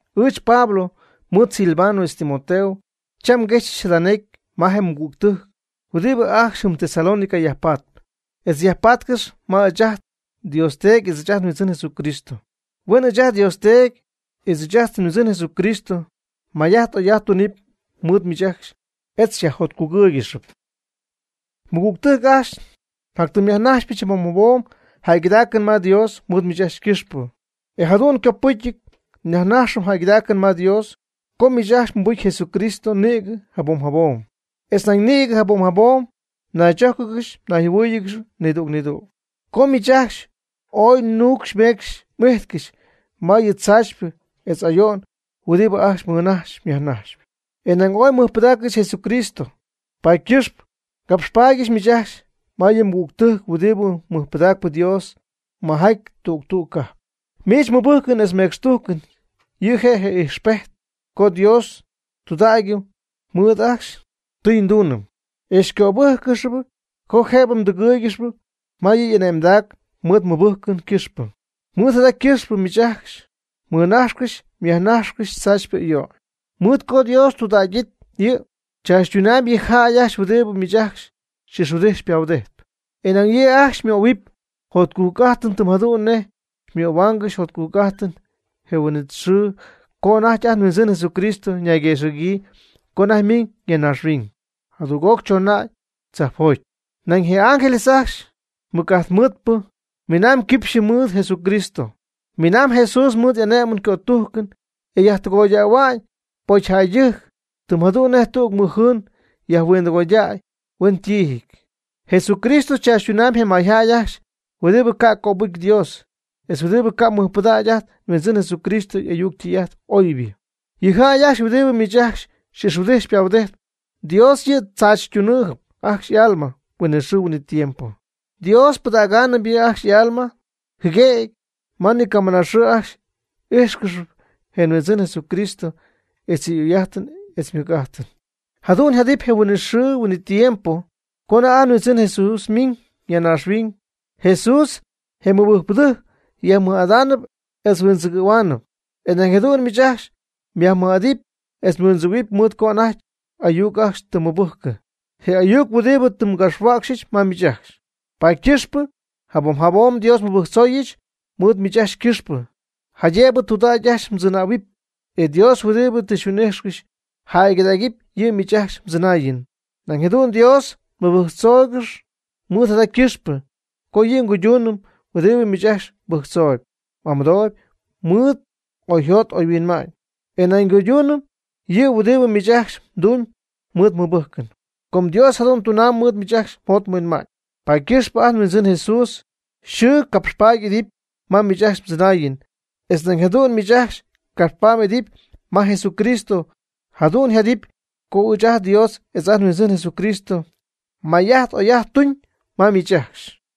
Ɨɨch Pablo mɨɨd Silvano etz Timoteo cham nguexyɨch jada necy ma je mɨgügtɨjc huɨdibɨ ajcxy jɨm Tesalónica yajpatp, etz yajpatcɨxy ma ɨɨch ajt nDios Teedy etz ajt nHuindzɨn Jesucristo. Huen ɨɨch ajt nDios Teedy etz ɨɨch ajt nHuindzɨn Jesucristo may'ajt oy'ajt tunɨpy mɨɨd miich ajcxy etz xyajjotcugɨ́ɨygɨxɨp. Mɨgügtɨjc ajcxy, njatytɨmyajnajxypɨch jabom jabom jäygɨdaacɨn ma Dios mɨɨd miich ajcxy ycɨxpɨ. E jadu'n copɨcy nyajnaxyɨch jäygɨdaacɨn ma Dios, com miich ajcxy mɨbɨjcpy Jesucristo nïgɨ jabom jabom, etz nañ nïgɨ jabom jabom naychójcɨgɨxy nayjɨhuɨ́ɨyɨgɨxy nidüg nidüg. Com miich ajcxy ooy nuucxy meecxy m'ijtcɨxy ma yɨ tzaachypɨ etz ayo'n huɨdibɨ ajcxy mmɨnajxyp myajnajxyp, e nañ ooy mmɨjpɨdaaccɨxy Jesucristo, paady ycɨxpɨ ngapxpaadyɨch miich ajcxy ma yɨ mɨgügtɨjc huɨdibɨ mɨjpɨdaacp Dios majaty tüg tüg cajp. Miich mmɨbɨjcɨn etz mmecxtujcɨn yɨ' je' ijxpejtɨp co Dios ytudägyɨty mɨɨd ajcxy ytɨyduunɨn, e xycöbɨjccɨxy co jëbɨ mdɨgɨ́ɨygɨxɨpy ma yɨ y'ane'mdac mɨɨd mmɨbɨjcɨn ycɨxpɨ. Mɨɨd jada ycɨxpɨ miich ajcxy mmɨnajxcɨxy myajnajxcɨxy tzaachypɨ ayo'n. Mɨɨd co Dios ytudägɨty, yɨ' tzaachytunamb yɨ jäy ajcxy huɨdibɨ miich ajcxy xy'ixhuɨdijtp xypahuɨdijtp. E nañ yɨ' ajcxy xymöhuɨpy jotcujc'ajtɨn tɨm jadu'n nej xymöhuáangɨxyɨch jotcujc'ajtɨn je huin'it xɨɨ co anajty ajt nHuindzɨn Jesucristo ñayguexɨ̈gyii co anajty miiñ ya naaxhuiñ jadüg'oc chooñ anajty tzajpjoty. Nañ je ángeles ajcxy mɨc'ajt mɨɨdpɨ miinaamb quipxyɨ mɨɨd Jesucristo. Miinaamb Jesús mɨɨd ane'mɨn cötujcɨn e yajtɨgoydähua'ñ pocyjäydɨjc, tɨm jadu'n nej tüg mɨjjɨɨn yajhuindɨgoydäy huen ytiijɨty. Jesucristo chaachytunamyb je mayjäy ajcxy huɨdibɨ ca'p cöbɨcy Dios, etz huɨdibɨ ca' mɨjpɨdägy ajt nHuindzɨn Jesucristo y'ayuc ytɨy'ajt oybɨ. Yɨ jäy ajcxy huɨdibɨ miich ajcxy xy'ixhuɨdijtp xypahuɨdijtp, Dios yɨ' tzaachytunaanɨp ajcxy y'alma huinɨxɨɨ huinɨtiempo. Dios ypɨdägaanɨp yɨ' ajcxy y'alma jɨguëgy ma ni camɨnaxɨɨ ajcxy ijxcɨxyp je nHuindzɨn Jesucristo etz yɨ' y'oy'ajtɨn etz ymɨc'ajtɨn. Jadu'n yjadɨpy je huin'it xɨɨ huin'it tiempo co anajty ajt nHuindzɨn Jesús miiñ ya naaxhuiñ, Jesús je mɨbɨjcpɨdɨjc yajmɨj'ada'ñ etz huindzɨgɨ̈hua'ñ, e nañ jadu'n miich ajcxy myajmɨj'adɨpy etz mhuindzɨgɨ̈huɨpy mɨɨd co anajty y'ayuc ajcxy tɨ mmɨbɨjccɨ, je ayuc huɨdibɨ tɨ ngapxhuäcxyɨch ma miich ajcxy. Paady ycɨxpɨ jabom jabom Dios nmɨbɨjctzooyɨch mɨɨd miich ajcxy ycɨxpɨ, jaydëbɨ tudägy ajcxy mdzɨnähuɨpy, e Dios huɨdibɨ tɨ xyhuin'ijxcɨxy yjäygɨdägɨpy yɨ' miich ajcxy mdzɨnaayɨn. Nañ jadu'n Dios nmɨbɨjctzoogɨxy mɨɨd jada ycɨxpɨ co yɨ' cuydunɨpy huɨdibɨ miich ajcxy mbɨjctzooyb m'amɨdooyb mɨɨd oyjot oyhuinma'ñ. E nañ ycuydunɨpy yɨ' huɨdibɨ miich ajcxy mdumyb mɨɨd mmɨbɨjcɨn. Com Dios jadu'n tunamb ma miich ajcxy mjot mhuinma'ñ, paady ycɨxpɨ ajt nHuindzɨn Jesucristo yxɨɨ capxpaady y'idɨpy ma miich ajcxy mdzɨnaayɨn etz nañ jadu'n miich ajcxy capxpaady m'idɨpy ma Jesucristo. Jadu'n yjadɨpy com ɨɨch ajt nDios etz ajt nHuindzɨn Jesucristo may'ajt oy'ajt tuñ ma miich ajcxy.